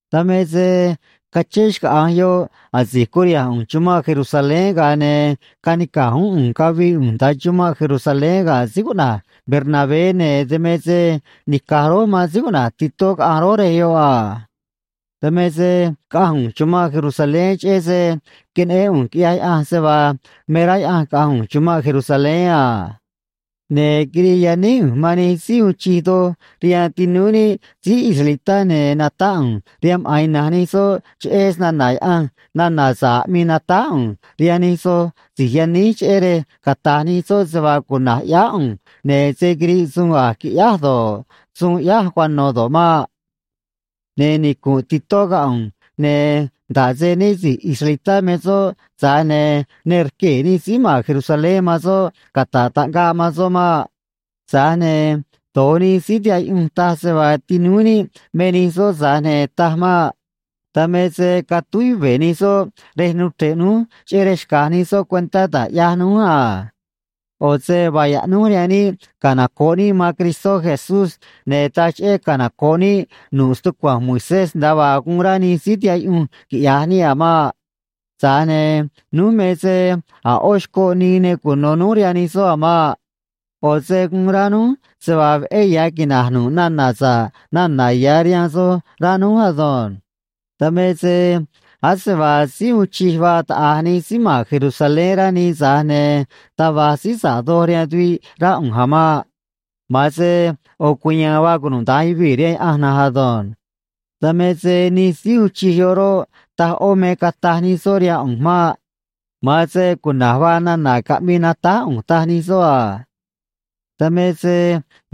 Dan me se cachén xcaꞌa̱nj yoꞌ asi̱j curiha̱nj ꞌu̱nj chumanꞌ Jerusalén, ga̱a ne̱ canica̱j uún ꞌu̱nj cavii ꞌu̱nj nda̱a chumanꞌ Jerusalén ga̱ síí cuꞌna̱j Bernabé, ne̱ dan me se nica̱j rój man síí cuꞌna̱j Titó caꞌanj rój rej yoꞌ a. Dan me se caꞌanj ꞌu̱nj chumanꞌ Jerusalén, cheꞌé se queneꞌén ꞌu̱nj quiꞌyaj Yaꞌanj se vaa me rá Yaꞌanj caꞌa̱nj ꞌu̱nj chumanꞌ Jerusalén a. Ne̱ quirii yaníj ꞌu̱nj man nij síí uun chij doj rihaan tinúú níꞌ síí israelitá, ne̱ natáꞌ ꞌu̱nj rihaan maꞌa̱n ina̱nj nij soꞌ cheꞌé snana̱ Yaꞌanj nana̱ sa̱ꞌ aꞌmii natáj ꞌu̱nj rihaan nij soj si̱j yaníj, cheꞌé rej cata̱j nij soꞌ se vaa cuna̱j ꞌyáá ꞌu̱nj, ne̱ se̱ quiriꞌ suun a̱j quiꞌyáj do̱ꞌ, suun ꞌyáj cuano̱ do̱ꞌ maꞌ. Ne̱ nicu̱nꞌ Titó ga̱ ꞌu̱nj, ne̱ nda̱ꞌ se né si̱j israelitá me soꞌ, tza̱j ne̱ ne rquee̱ nij síí ma̱n Jerusalén man soꞌ cata̱ꞌ taꞌngaꞌ man soꞌ maꞌ. Tza̱j ne̱ do̱j nij síí tihaꞌ yuꞌunj taj se vaa tinúú níꞌ me nij soꞌ, tza̱j ne̱ taj maꞌ. Dan me se catúj yuve̱ nij soꞌ rej nuu chre̱ꞌ núj cheꞌé rej xca̱j nij soꞌ cuentá da̱j ꞌyaj núj a. ꞌO̱ se vaa yaꞌnúj rihaan níꞌ canoco̱ꞌ níꞌ man Cristó Jesús, ne̱ taj cheꞌé canoco̱ꞌ níꞌ nu̱ꞌ stucua̱nj Moisés nda̱a vaa guun rá nij síí tihaꞌ yuꞌunj quiꞌya̱j níꞌ a̱ maꞌ. Tza̱j ne̱ núj me se a̱ ꞌó xcoꞌ nii ne cuno̱ núj rihaan nij soꞌ a̱ maꞌ. ꞌO̱ se guun rá núj se vaa veꞌé ya̱ quina̱j nu̱ꞌ nana̱ sa̱ꞌ nana̱ ya̱ rihaan soj, rá núj ado̱nj. Dan me se ase vaa síí uun chij vaa taꞌa̱j nij síí ma̱n Jerusalén, rá nii, tza̱j ne̱ taj va̱j síí sa̱ꞌ doj rihaan tuviꞌ, rá ꞌu̱nj a̱ maꞌ. Ma̱an se ꞌo̱ cuya̱a̱n vaa cunuda̱nj yuvii̱ rihaan Yaꞌanj na̱nj ado̱nj. Dan me se nij síí uun chij yoꞌ roꞌ, taj ꞌó me cataj nij soꞌ rihaan ꞌu̱nj maꞌ. Ma̱an se cuna̱j vaa nana̱ caꞌmii natáj ꞌu̱nj, taj nij soꞌ a. Dan me se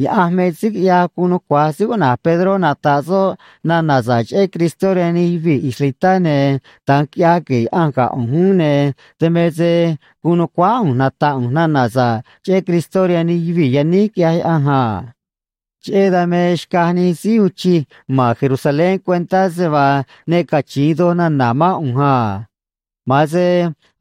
Yaꞌanj me síí quiꞌyaj guun nucua̱j síí cuꞌna̱j Pedró nata̱ꞌ soꞌ nana̱ sa̱ꞌ cheꞌé Cristó rihaan nij yuvii̱ israelitá, ne̱ da̱nj quiꞌyaj gue̱e̱ Yaꞌanj ga̱ ꞌu̱nj uún, ne̱ dan me se guun nu̱cuáá ꞌu̱nj nata̱ꞌ ꞌu̱nj nana̱ sa̱ꞌ cheꞌé Cristó rihaan nij yuvii̱ yaníj, quiꞌyaj Yaꞌanj a. Cheꞌé dan me xcaj nij síí uun chij ma̱n Jerusalén cuentá se vaa ne cachi̱in doj nana̱ mán ꞌu̱nj a. Ma̱an se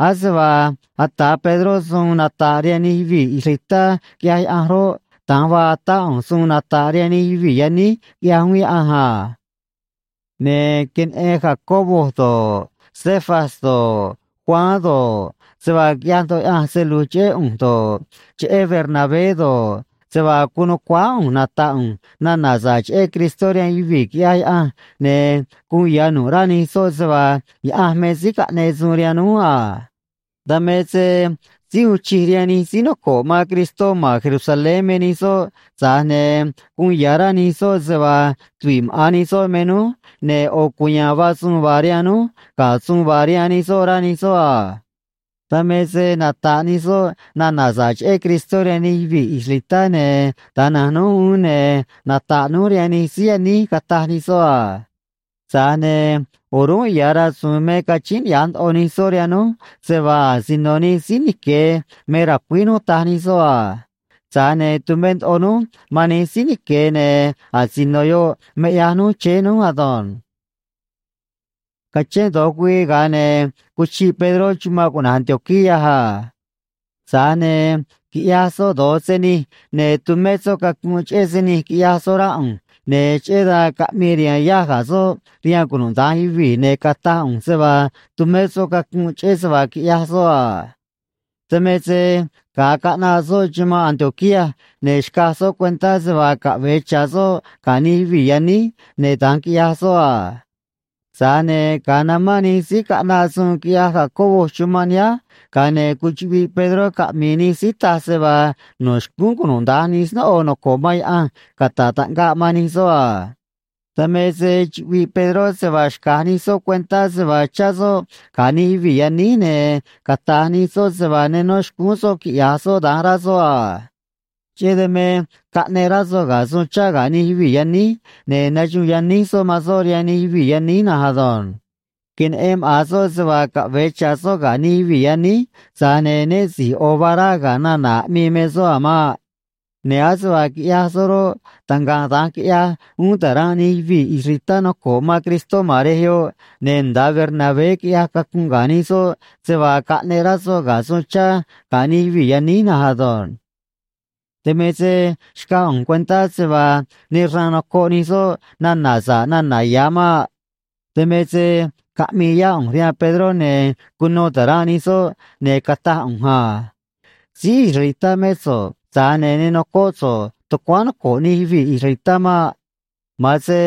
ase vaa ata̱ Pedró suun nata̱ꞌ rihaan nij yuvii̱ israelitá, quiꞌyaj Yaꞌanj roꞌ, da̱nj vaa atá ꞌu̱nj suun nata̱ꞌ rihaan nij yuvii̱ yaníj, quiꞌyaj uún Yaꞌanj a. Ne̱ queneꞌen Jacobo do̱ꞌ, Cefas do̱ꞌ, Juan do̱ꞌ, se vaa quiꞌyaj ndoꞌo Yaꞌanj se lu̱j cheꞌé ꞌu̱nj do̱ꞌ, cheꞌé Bernabé do̱ꞌ, se vaa guun nu̱cuáá ꞌu̱nj nata̱ꞌ ꞌu̱nj nana̱ sa̱ꞌ cheꞌé Cristó rihaan yuvii̱, quiꞌyaj Yaꞌanj, ne̱ guun ya̱ nu̱ꞌ rá nij soꞌ se vaa Yaꞌanj me síí caꞌneꞌ suun rihaan núj a. Dan me se síí uun chij rihaan nij síí noco̱ꞌ man Cristó ma̱n Jerusalén me nij soꞌ, tza̱j ne̱ guun ya̱ rá nij soꞌ se vaa tuviꞌ maꞌa̱n nij soꞌ me núj, ne̱ ꞌo̱ cuya̱a̱n vaa suun vaa rihaan núj ga̱ suun vaa rihaan nij soꞌ, rá nij soꞌ a. Dan me se nata̱ꞌ nij soꞌ nana̱ sa̱ꞌ cheꞌé Cristó rihaan nij yuvii̱ israelitá, ne̱ da̱nj na̱nj núj uún, ne̱ nata̱ꞌ núj rihaan nij síí yaníj, cataj nij soꞌ a. Tza̱j ne̱ o̱rúnꞌ ya̱ rasu̱u̱n me cachíín niꞌya̱j ndoꞌo nij soꞌ rihaan núj se vaa asino nij síí nique̱ me ra̱cuíj núj, taj nij soꞌ a. Tza̱j ne̱ tumé ndoꞌo núj man nij síí nique̱, ne̱ asino yoꞌ me ꞌyaj núj chéé núj ado̱nj. Cachén do̱j güii, ga̱a ne̱ cuchiꞌ Pedró chumanꞌ cuꞌna̱j Antioquía a. Tza̱j ne̱ quiꞌyaj soꞌ do̱j se nij, ne̱ tumé soꞌ cacunꞌ cheꞌé se nij quiꞌyaj soꞌ, rá ꞌu̱nj, ne̱ cheꞌé dan caꞌmii riha̱a̱n yáj ga̱ soꞌ rihaan cunuda̱nj yuvii̱, ne̱ cataj ꞌu̱nj se vaa tumé soꞌ cacunꞌ cheꞌé se vaa quiꞌyaj soꞌ a. Dan me se ga̱a caꞌnaꞌ soꞌ chumanꞌ Antioquía, ne̱ xcaj soꞌ cuentá se vaa caꞌve̱e cha̱ soꞌ ga̱ nij yuvii̱ yaníj, ne̱ da̱nj quiꞌyaj soꞌ a. Tza̱j ne̱ ga̱a namán nij síí caꞌnaꞌ suun quiꞌyaj Jacobo chumanꞌ nihánj, ga̱a ne̱ cuchuꞌviꞌ Pedró caꞌmi̱i̱ nij síí taj se vaa no̱ xcúún cunuda̱nj nij snóꞌo noco̱ꞌ man Yaꞌanj cata̱ꞌ taꞌngaꞌ man nij soꞌ a. Dan me se chuꞌviꞌ Pedró se vaa xca̱j nij soꞌ cuentá se vaa chá soꞌ ga̱ nij yuvii̱ yaníj, ne̱ cata̱j nij soꞌ se vaa ne nó xcúún soꞌ quiꞌya̱j soꞌ da̱nj, rá soꞌ a. Cheꞌé dan me caꞌneꞌ rá soꞌ ga̱ suun chá ga̱ nij yuvii̱ yaníj, ne̱ naxuun yaníj soꞌ man soꞌ rihaan nij yuvii̱ yaníj na̱nj ado̱nj. Queneꞌen maꞌa̱n soꞌ se vaa caꞌve̱e cha̱ soꞌ ga̱ nij yuvii̱ yaníj, tza̱j ne̱ né si̱j ꞌo̱ vaa rá ga̱ nana̱ aꞌmii me soꞌ a̱ maꞌ. Ne̱ ase vaa quiꞌyaj soꞌ roꞌ, taꞌngaꞌ da̱nj quiꞌyaj uún ta̱ranꞌ nij yuvii̱ israelitá noco̱ꞌ man Cristó ma̱n rej yoꞌ, ne̱ nda̱a Bernabé quiꞌyaj cacunꞌ ga̱ nij soꞌ se vaa caꞌneꞌ rá soꞌ ga̱ suun chá ga̱ nij yuvii̱ yaníj na̱nj ado̱nj. Dan me se xcaj ꞌu̱nj cuentá se vaa ne xraan nocoꞌ nij soꞌ nana̱ sa̱ꞌ nana̱ ya̱ maꞌ. Dan me se caꞌmii yá ꞌu̱nj rihaan Pedró, ne̱ cuno ta̱ranꞌ nij soꞌ, ne̱ cataj ꞌu̱nj a: “Síí israelitá mé so̱ꞌ, tza̱j ne̱ ne nocóꞌ so̱ꞌ tucuáán noco̱ꞌ nij yuvii̱ israelitá maꞌ. Ma̱an se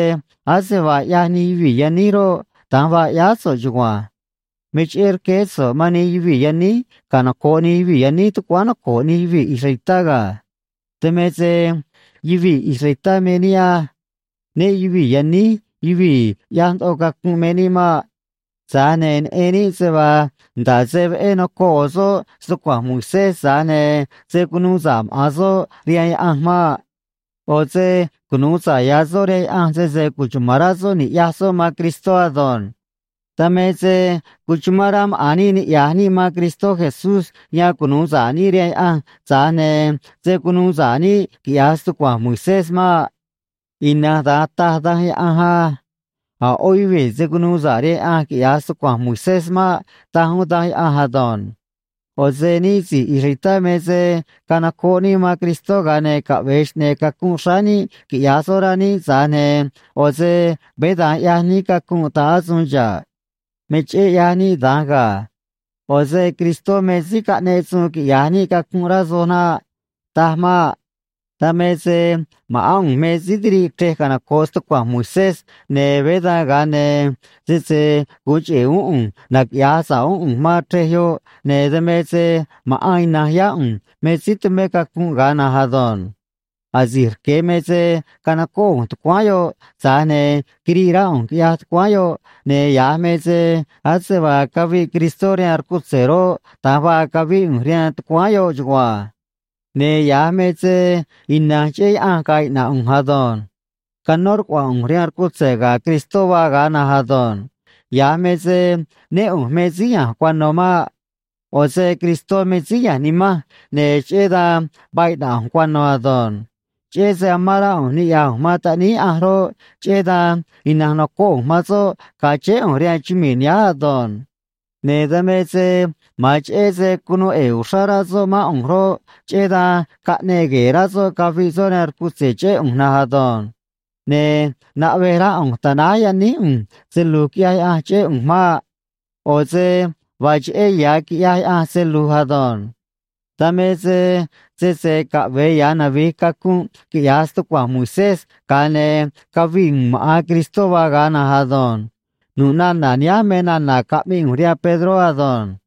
ase vaa ꞌyaj nij yuvii̱ yaníj roꞌ, da̱nj vaa ꞌyáá so̱ꞌ chugua̱nj. Me cheꞌé rqueé so̱ꞌ man nij yuvii̱ yaníj canoco̱ꞌ nij yuvii̱ yaníj tucuáán noco̱ꞌ nij yuvii̱ israelitá ga̱. Dan me se yuvii̱ israelitá me níꞌ á. Né yuvi̱i̱ yaníj yuvii̱ ꞌyaj ndoꞌo cacunꞌ me níꞌ maꞌ. Tza̱j ne̱ neꞌen níꞌ se vaa nda̱ꞌ se veꞌé nocoꞌ ꞌo̱ soꞌ stucua̱nj Moisés, tza̱j ne̱ se̱ cunuu sa̱ꞌ maꞌa̱n soꞌ rihaan Yaꞌanj maꞌ. ꞌO̱ se cunu̱u sa̱ꞌ ya̱ soꞌ rihaan Yaꞌanj sese cuchuma̱n rá soꞌ ni̱ꞌyaj soꞌ man Cristó ado̱nj. Dan me se cuchumán rá maꞌa̱n níꞌ niꞌya̱j níꞌ man Cristó Jesús, yan cunu̱u sa̱ꞌ níꞌ rihaan Yaꞌanj, tza̱j ne̱ se̱ cunuu sa̱ꞌ níꞌ, quiꞌya̱j stucua̱nj Moisés maꞌ. Ina̱nj da̱nj taj Danj Yaꞌanj á. A̱ ꞌó yuvii̱ se̱ cunuu sa̱ꞌ rihaan Yaꞌanj quiꞌya̱j stucua̱nj Moisés maꞌ, taj uún Danj Yaꞌanj ado̱nj. ꞌO̱ se níꞌ si̱j israelitá me se canocoꞌ níꞌ man Cristó, ga̱a ne̱ caꞌve̱e xꞌne̱e̱ cacunꞌ xráá níꞌ quiꞌya̱j soꞌ, rá níꞌ, tza̱j ne̱ ꞌo̱ se veé da̱nj ꞌyaj níꞌ cacunꞌ ta̱ꞌ asuun xa̱ꞌ. Me cheꞌé ꞌyaj níꞌ da̱nj ga̱. ꞌO̱ se Cristó me síí caꞌneꞌ suun quiꞌya̱j níꞌ cacunꞌ, rá so̱ꞌ naꞌ. Taj maꞌ. Dan me se ma̱ꞌán ꞌu̱nj me síí tiriꞌ chrej canoco̱ꞌ stucua̱nj Moisés, ne̱ veé dan, ga̱a ne̱ sese gu̱un cheꞌe̱ uún ꞌu̱nj naquiꞌya̱j sa̱ꞌ uún ꞌu̱nj man chrej yoꞌ, ne̱ dan me se maꞌa̱n ina̱nj yá ꞌu̱nj me síí tumé cacunꞌ ga̱a na̱nj ado̱nj. Asi̱j rque̱ me se canocóꞌ ꞌu̱nj tucuáán yoꞌ, tza̱j ne̱ quiriꞌ rá ꞌu̱nj, quiꞌyaj tucuáán yoꞌ, ne̱ ya̱j me se ase vaa caviꞌ Cristó rihaan rcutze̱ roꞌ, da̱nj vaa cavíꞌ ꞌu̱nj rihaan tucuáán yoꞌ chugua̱nj. Ne̱ ya̱j me se ina̱nj cheꞌé Yaꞌanj ga̱a̱ iꞌna̱ꞌ ꞌu̱nj ado̱nj. Canó rcuaꞌa̱a̱n ꞌu̱nj rihaan rcutze̱ ga̱ Cristó vaa ga̱a na̱nj ado̱nj. Ya̱j me se né ꞌu̱nj me síí ya̱nj cuano̱ maꞌ. ꞌO̱ se Cristó me síí ya̱nj nimanj, ne̱ cheꞌé dan vaa iꞌna̱ꞌ ꞌu̱nj cuano̱ ado̱nj. Cheꞌé se amán rá ꞌu̱nj niꞌya̱j ꞌu̱nj man Taꞌníí Yaꞌanj roꞌ, cheꞌé dan ina̱nj nocóꞌ ꞌu̱nj man soꞌ ga̱a chéé ꞌu̱nj rihaan chumii̱ nihánj ado̱nj. Ne̱ dan me se ma̱an cheꞌé se cunuu ꞌe̱e̱ uxrá rá soꞌ mán ꞌu̱nj roꞌ, cheꞌé dan caꞌneꞌ gue̱e̱ rá soꞌ caviꞌ soꞌ rihaan rcutze̱ cheꞌé ꞌu̱nj na̱nj ado̱nj. Ne̱ naꞌvej rá ꞌu̱nj ta̱náj yaníj ꞌu̱nj se lu̱j quiꞌyaj Yaꞌanj cheꞌé ꞌu̱nj maꞌ. ꞌO̱ se vaa cheꞌé ya̱ quiꞌyaj Yaꞌanj se lu̱j ado̱nj. Dan me se sese caꞌve̱e ya̱ navi̱j cacunꞌ quiꞌya̱j stucua̱nj Moisés, ga̱a ne̱ caviꞌ u̱u̱n maꞌa̱n Cristó vaa ga̱a na̱nj ado̱nj.” Nu̱ꞌ nana̱ nihánj me nana̱ caꞌmii ꞌu̱nj rihaan Pedró ado̱nj.